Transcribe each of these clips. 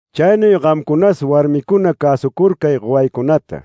Chaynuy gamcunas warmicuna cäsucurcay gowaycunata,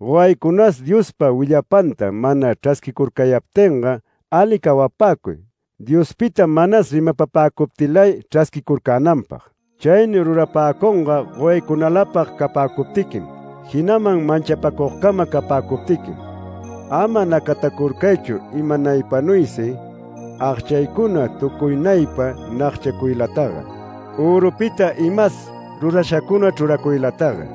gowaycunas Diospa willapanta mana chrasquicurcayaptinga ali cawapäcuy Diospita manas rimapapäcuptilay chrasquicurcänanpag. Chaynuy rurapäcunga, gowaycunalapag capäcuptiquim, jinaman manchapäcugcama capäcuptiquim. Ama nacatacurcaychu imanaypanuysi agchaycuna tucuynaypa nagchacuylataga, örupita imas rurashacuna chruracuylataga,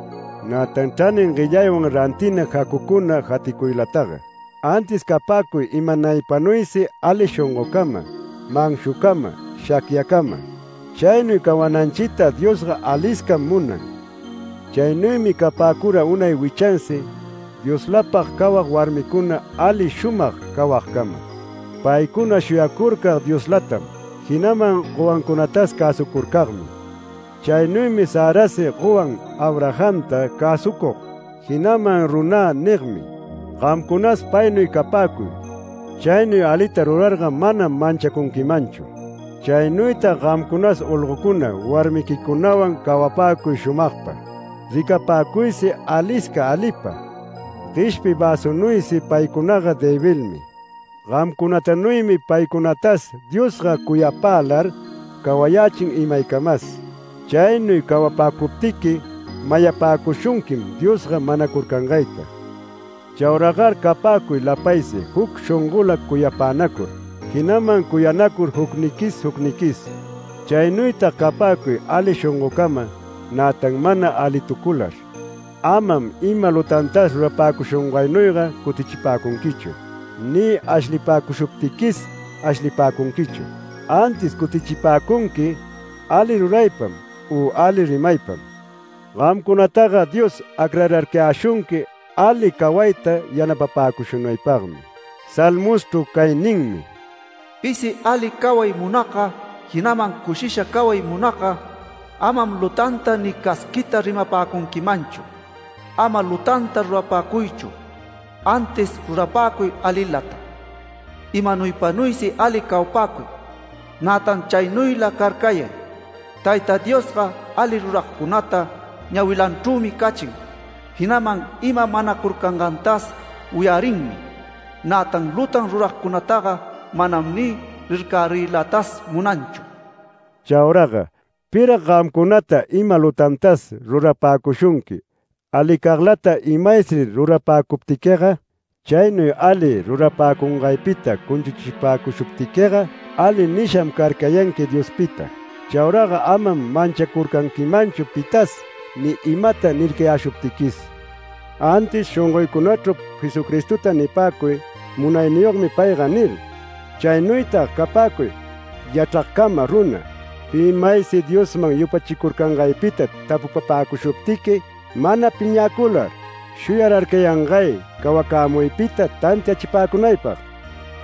nätan chranin guellaywan rantina jacucuna jaticuylataga. Antis capäcuy imanaypanuysi ali shongocama, manshucama, shacyacama. Chaynuy cawananchita Diosga aliscam munan. Chaynuymi capäcura unay wichansi Dioslapag cawag warmicuna ali shumag cawagcama, paycuna shuyacurcag Dioslatam, jinaman gowancunatas cäsucurcagmi. Chaynuymi Sarasi gowan Abrahamta cäsucug, jinaman “Runä” nigmi. Gamcunas paynuy capäcuy chaynuy alita rurarga manam manchacunquimanchu. Chaynuytag gamcunas olgocuna warmiquicunawan cawapäcuy shumagpa. Ricapäcuysi alisca alipa, gueshpi väsunuysi paycunaga debilmi. Gamcunatanuymi paycunatas Diosga cuyapälar cawayächin imaycamas. Chaynuy cawapäcuptiqui mayapäcushunquim Diosga manacurcangayta. Chauragar capäcuy lapaysi juc shongola cuyapänacur, jinaman cuyanacur jucniquis jucniquis. Chaynuytag capäcuy ali shongoncama, nätan mana alitucular. Amam ima lutantas rurapäcushungaynuyga cutichipäcunquichu, ni ashlipäcushuptiquis ashlipäcunquichu. Antis cutichipäcunqui ali ruraypam u ali rimaypam. Gamcunataga Dios acrararcayäshunqui ali cawayta yanapapäcushunaypagmi. Salmoschru cay ninmi: “Pisi ali caway munagga, jinaman cushisha caway munagga, amam lutanta ni casquiyta rimapäcunquimanchu. Ama lutanta rurapäcuychu, antis rurapäcuy alilata. Imanaypanuysi ali cawapäcuy, nätan chaynuyla carcayay. Tayta Diosga ali ruragcunata ñawilanchrümi cachin jinaman ima manacurcangantas wiyarinmi. Nätan lutan ruragcunataga manam ni rircariylatas munanchu”. Chauraga ¿pirag gamcunata ima lutantas rurapäcushunqui, alicaglata imaysi rurapäcuptiquiga? Chaynuy ali rurapäcungaypita cunchuchipäcushuptiquiga ali nisham carcayanqui Diospita. Chauraga amam manchacurcanquimanchu pitas ni imata nircayäshuptiquis. Antis shongoycunachru Jesucristota nipäcuy: “Munayniyogmi payga” nir. Chaynuytag capäcuy yachragcama runa. Pi maysi Diosman yupachicurcangaypita tapupapäcushuptiqui mana piñäcular shuyararcayangay cawacämuypita tantiachipäcunaypag.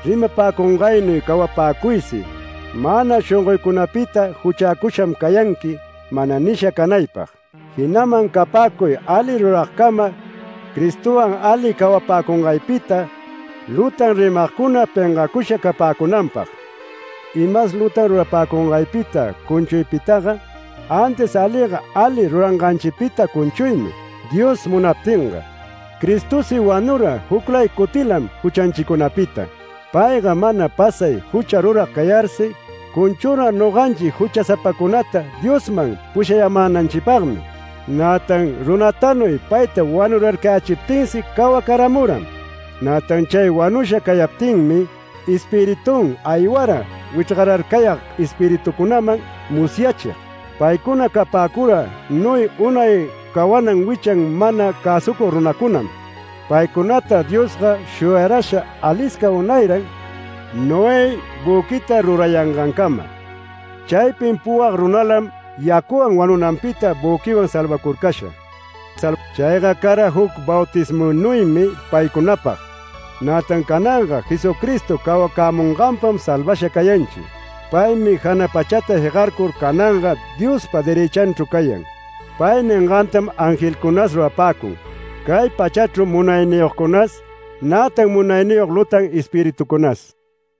Rimapäcungaynuy cawapäcuysi mana shongoycunapita “Juchäcusham cayanqui” mana nisha canaypag, jinaman capäcuy ali ruragcama Cristowan ali cawapäcungaypita lutan rimagcuna pengacusha capäcunanpag. Imas lutan rurapäcungaypita cunchuypitaga, antis aliga, ali ruranganchipita cunchuymi, Dios munaptinga. Cristosi wanura juclay cutilam juchanchicunapita. Payga mana pasay jucha rurag cayarsi cunchura noganchi juchasapacunata Diosman pushayämänanchipagmi. Nätan runatanuy payta wanurarcayächiptinsi cawacaramuram. Nätan chay wanusha cayaptinmi Espiritun aywara wichrgararcayag espiritucunaman musyachig. Paycuna capäcura Noé unay cawanan wichan mana cäsucug runacunam. Paycunata Diosga shuyarasha alisca unayran Noé büquita rurayangancama. Chaypin puwag runalam yacuwan wanunanpita büquiwan salvacurcasha. Chayga cara juc bautismunuymi paycunapag, nätan cananga Jesucristo cawacämunganpam salvasha cayanchi. Paymi jana pachata jegarcur cananga Diospa derëchanchru cayan, pay ningantam angelcunas rurapäcun, cay pachachru munayniyogcunas nätan munayniyog lutan espiritucunas.